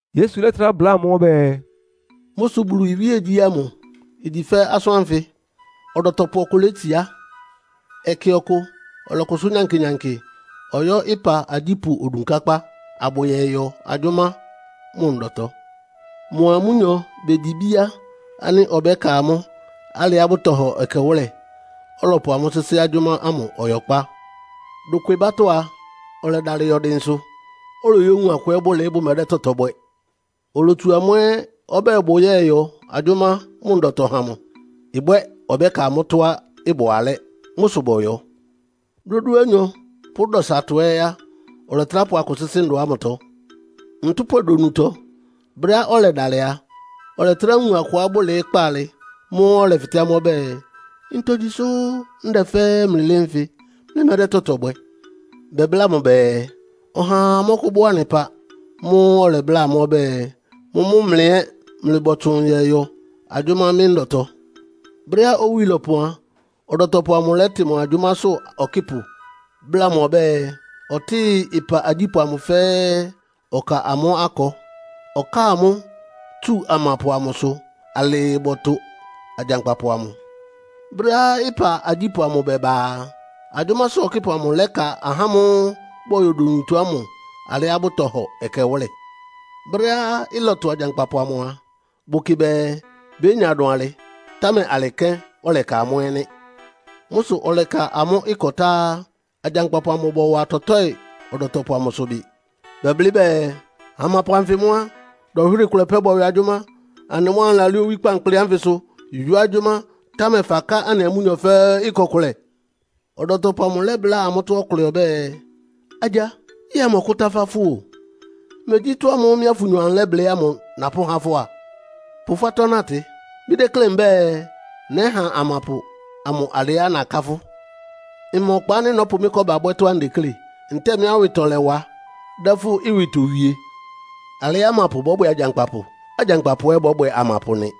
Yesu lɛ́trá bláa amʋ́ ɔbɛ́ɛ, “Mʋ́ sʋ Bulu iwíegyí ámʋ igyi fɛ́ asʋ́n ánfɩ. Ɔdɔtɔpʋ ɔkʋ létsiá. Ɛkɛ ɔkʋ ɔlɔkʋsʋ́ nyankɩ-nyankɩ ɔyɔ́ ɩpa agyípʋ́ odunkákpá, abʋyɔyɔ agyʋ́má mʋ ndɔtɔ. Mʋa amʋ́nyɔ begyi bíá ánɩ́ ɔbɛ́ka amʋ́ alɩá bʋtɔhɔ ɛkɛwʋ́lɛ, ɔlɔpʋ amʋ́ sɩ́sɩ́ agyʋ́má ámʋ ɔyɔkpá. Dokwebátɔ́ a, ɔlɛdalɩ yɔ dɩnsʋ, oloyówun akʋ ɛ́ bʋlɩɩ́, bʋmɛdɛ́ tɔtɔ bwɛ. Olotsu amʋ́ ɛ́ ɔbɛ́ɛ bʋyɔ́yɔ agyʋ́má mʋ ndɔtɔ ha mʋ. Ɩbwɛ́ ɔbɛ́ka amʋ́ tɔ́á ɩbʋ alɛ́. Mʋ́ sʋ bɔyɔ. Dódúanyɔ pʋ́ dɔsatɔ ɛ́ á, ɔlɛtrá pʋ akʋ sɩ́sɩ́ ndɔ ámʋtɔ. Ntʋ́pwɛ donutɔ, brɛ́á ɔlɛdalɩ a, ɔlɛtrá wun akʋá bʋlɩɩ́ kpaalɩ. Mʋ́ʋ́ ɔlɛfɩtɛ́ amʋ́ ɔbɛ́ɛ, ‘Ntogyi sʋ́ ndɛ fɛ́ɛ́ mlɩlɩ́ɩ́ nfɩ, mlɩmɛ́dɛ́ tɔtɔ bwɛ?’ Bɛbláa mʋ bɛɛ, ‘Ɔhaa mɔ́kʋ́bɔ́ anɩ ɩpa.’ Mʋ́ʋ́ ɔlɛbláa amʋ́ ɔbɛ́ɛ, ‘Mʋ́mʋ́ mlɩ ɛ́ mlɩbɔtsʋn yɔyɔ agyʋ́má mɩ́ ndɔtɔ.’ “Brɛ́á owí lɔpɔn a, ɔdɔtɔpʋ amʋ lɛ́tɩ mʋ agyʋ́másʋ́ ɔkɩ́pʋ bláa mʋ ɔbɛ́ɛ, ɔtɩ́ɩ ɩpa agyípʋ́ ámʋ fɛ́ɛ́, ɔkáa amʋ́ akɔ. Ɔkáa amʋ́ tsu amapʋ amʋsʋ alɩɩ bɔtʋ agyankpapʋ amʋ. Brɛ́á ɩpa agyípʋ́ amʋ bɛba a, agyʋ́másʋ́ ɔkɩ́pʋ amʋ lɛ́ka ahá ámʋ́ʋ́ bɔyɔ donutɔ ámʋ alɩá bʋtɔhɔ ɛkɛwʋ́lɛ. Brɛ́á ɩlɔtʋ agyankpapʋ amʋ a, bʋkɩ bɛɛ bénya dʋn alɩ, támɛ alɩ kɛ́n ɔlɛka amʋ́ ɛ́ nɩ́. Mʋ́ sʋ ɔlɛka amʋ́ akɔ tá á, agyankpapʋ amʋ bɔwa tɔtɔ́ɩ ɔdɔtɔpʋ amʋsʋ bɩ. Bɛblɩ́ bɛɛ, ‘Amapʋ anfɩ mʋ́ á, dɔnhwɩ́rɩ kʋlɛ pɛ́ bɔyɔ agyʋ́má. Anɩ mʋ́ anɩlalɩ́ɩ́ owí kpankpli ánfɩsʋ yɔ́ agyʋ́má, támɛ faká anɩa amʋ́nyɔ fɛ́ɛ́ akɔ kʋlɛ.’ “Ɔdɔtɔpʋ amʋ lɛ́bláa amʋ́tɔ́ ɔkʋlɛ ɔbɛ́ɛ, ‘Agya, yɛ́ɛ mmɔkʋ́tafá fʋ o! Megyí ɩtɔ́ ámʋ́ʋ́ mɩ́a fʋnyɔ anɩlɛ́blɩ́ ámʋ napʋ́há fʋ́ á? Pʋ fʋ́ atɔ́ natɩ. Mɩ́déklé mbɛ́ɛ, nɛ́ha amapʋ amʋ alɩá naká fʋ́. Mma ɔkpa ánɩ́ nɔ́pʋ mɩ́ kɔ́ba bwɛ́ tɔ́á ndeklé? Ntɛ́ɛ mɩ́ awɩtɔlɛwa dɛ́ fʋ́ ɩwɩtɔ wie?’ “Alɩ́ amapʋ bɔ́bwɛ agyankpapʋ, agyankpapʋ ɛ́ bɔ́bwɛ amapʋ nɩ.”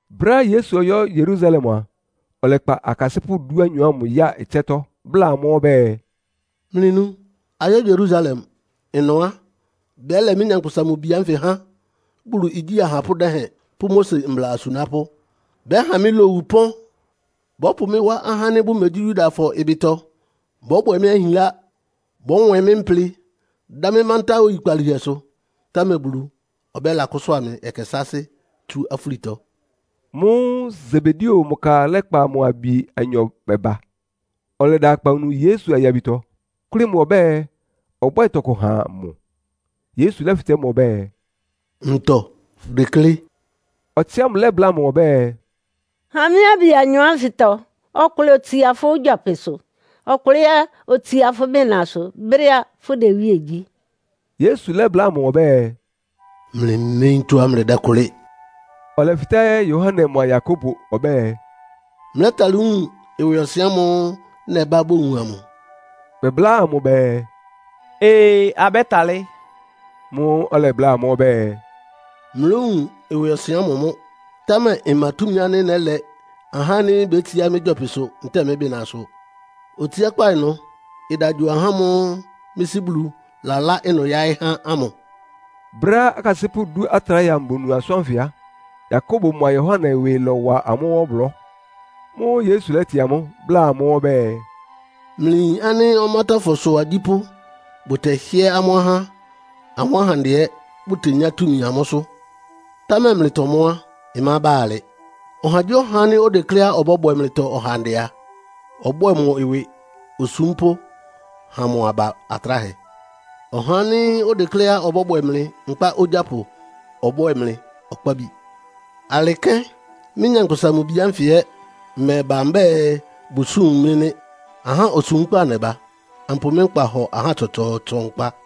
Brɛ́á Yesu ɔyɔ́ Yerusalem a, ɔlɛkpa akasɩ́pʋ́ dúanyɔ ámʋ ya ɩtsɛ́tɔ́ bláa amʋ́ ɔbɛ́ɛ, “Mlɩnu! Ayɔ́ Yerusalem. Ɩnʋ á, bɛ́lɛ mɩ́, Nyankpʋsa-Mʋ-Bi ánfɩ há Bulu igyí ahapʋ́ dɛhɛn pʋ́ Mose mbla asunápʋ́. Bɛ́ha mɩ́ lowu ɩpɔ́n. Bɔ́pʋ mɩ́ wá ahá ánɩ́ bʋmegyí Yudafɔ ɩbɩtɔ bɔ́bwɛ mɩ́ ahinlá, bɔ́nwɛn mɩ́ mplɩ, dá mɩ́ mántá oyikpalíhɛsʋ. Támɛ Bulu ɔbɛ́lakʋ́sʋ́a mɩ ɛkɛ sáásɩ́ tsú afúlitɔ.” Mʋ́ʋ́ Sebedeo mʋ ka lɛ́kpa mʋ abi anyɔ bɛba, ɔlɛda akpawunu Yesu ayabitɔ, kʋ́lɩ́ mʋ ɔbɛ́ɛ, ɔbwɛ́ɛ tɔkʋ ha mʋ. Yesu lɛ́fɩtɛ́ mʋ ɔbɛ́ɛ, “Ntɔ fʋdeklé?” Ɔtsɩ ámʋ lɛ́bláa mʋ ɔbɛ́ɛ, “Ha mɩ́ abi anyɔ ánfɩtɔ ɔkʋlɛ otsia fʋ́ gyɔpɩsʋ, ɔkʋlɛ ɛ́ otsia fʋ́ bɩnasʋ brɛ́á fʋ́dɛ iwíe gyí.” Yesu lɛ́bláa amʋ́ ɔbɛ́ɛ, “Mlɩméyín tɔ́á mlɩdɛ́kʋlɩ́.” Ɔlɛfɩtɛ́ Yohane mʋa Yakobo ɔbɛ́ɛ, “Mlɛ́talɩ́ wun ɩwɩɔsɩn ámʋ́ʋ́ nɛbá bowun amʋ?” Bɛbláa mʋ bɛɛ, “Ee, abɛ́talɩ́.” Mʋ́ʋ́ ɔlɛbláa amʋ́ ɔbɛ́ɛ, “Mlówun ɩwɩɔsɩn ámʋ mʋ́, támɛ mma túmi ánɩ́ nɛ́lɛ ahá ánɩ́ bétsiá mɩ́ gyɔpɩsʋ ntɛ́ɛ mɩ́ bɩnasʋ. Otsiákpá ɩnʋ ɩda gyo ahá ámʋ́ʋ́ mɩ́ Sɩ́ Bulu lalá ɩnʋ yáɩ́ há ámʋ.” Brɛ́á akasɩ́pʋ́ dú atráhɛ amʋ bonu asʋ́n ánfɩ á, Yakobo mʋa Yohane ɩwɩ lɔ́wa amʋ́ ɔblɔ́. Mʋ́ʋ́ Yesu lɛ́tɩ amʋ́, bláa amʋ́ ɔbɛ́ɛ, “Mlɩyin ánɩ́ ɔmátɔ́fɔsʋ agyípʋ́ bʋtɛhɩ́ɛ́ amʋ́ ahá, amʋ́ ahandɛ ɛ́ bʋtenyá túmi amʋ́sʋ́. Támɛ mlɩtɔ mʋ́ á, ɩmába alɩ. Ɔhagyíɔha ánɩ́ odekléá ɔbɔ́bwɛ mlɩtɔ ɔhandɛ a, ɔbwɛ́ɛ mʋ ɩwɩ osúmpʋ́ ha mʋ aba atráhɛ. Ɔhá ánɩ́ odekléá ɔbɔ́bwɛ mlɩ nkpá ogyápʋ ɔbwɛ́ɛ mlɩ ɔkpábi. Alɩ kɛ́n mɩ́, Nyankpʋsa-Mʋ-Bi ánfɩ ɛ́ mmɛba mbɛ́ɛ, bʋsúm mɩ́ nɩ́. Ahá osúmkpá nɛba, ampʋ mɩ́ nkpa hɔ ahá tsɔtsɔɔtsɔ nkpa.”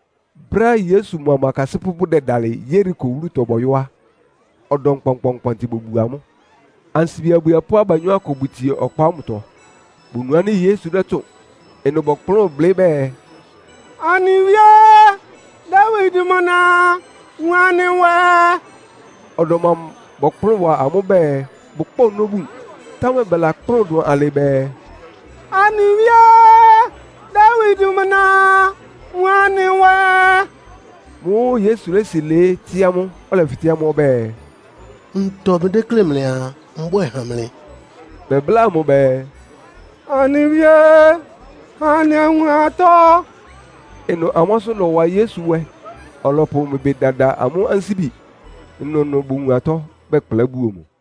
Brɛ́á Yesu mʋa mʋ akasɩ́pʋ́ bʋdɛdalɩ Yeriko wúlutɔ bɔyɔ́ á, ɔdɔm kpɔnkpɔɔnkpɔntɩ bobuo amʋ́. Ansibi abwiepʋ́ abanyɔ́ akʋ bʋtsie ɔkpa ámʋtɔ, bonu ánɩ́ Yesu dɛ́tsʋ́ʋn. Ɩnʋ bɔkplʋ́n blɩ́ bɛɛ, “Anɩ Wíe, Dawid mʋ na, wun anɩ nwɛ.” Ɔdɔm amʋ bɔkplʋ́n wa amʋ́ bɛɛ bʋkpá ɔnɔ́ bun. Támɛ bɛlakplʋ́n dʋn alɩ bɛɛ, “Anɩ Wíe, Dawid mʋ na, wun anɩ nwɛ!” Mʋ́ʋ́ Yesu lési lɩɩ́, tɩ́ amʋ́, ɔlɛfɩtɛ́ amʋ́ ɔbɛ́ɛ, “Ntɔ mlɩdéklé mlɩaa, mbwɛ́ɛ ha mlɩ?” Bɛbláa mʋ bɛɛ, “Anɩ Wíe, ha anɩ awun atɔ́.” Ɩnʋ amʋ́ asʋ́n lɔ́wa Yesu nwɛ, ɔlɔpʋ mʋ ɩbɩ dada amʋ́ ansíbi. Ɩnʋnʋ bowun atɔ́, bɛkplá buo mʋ.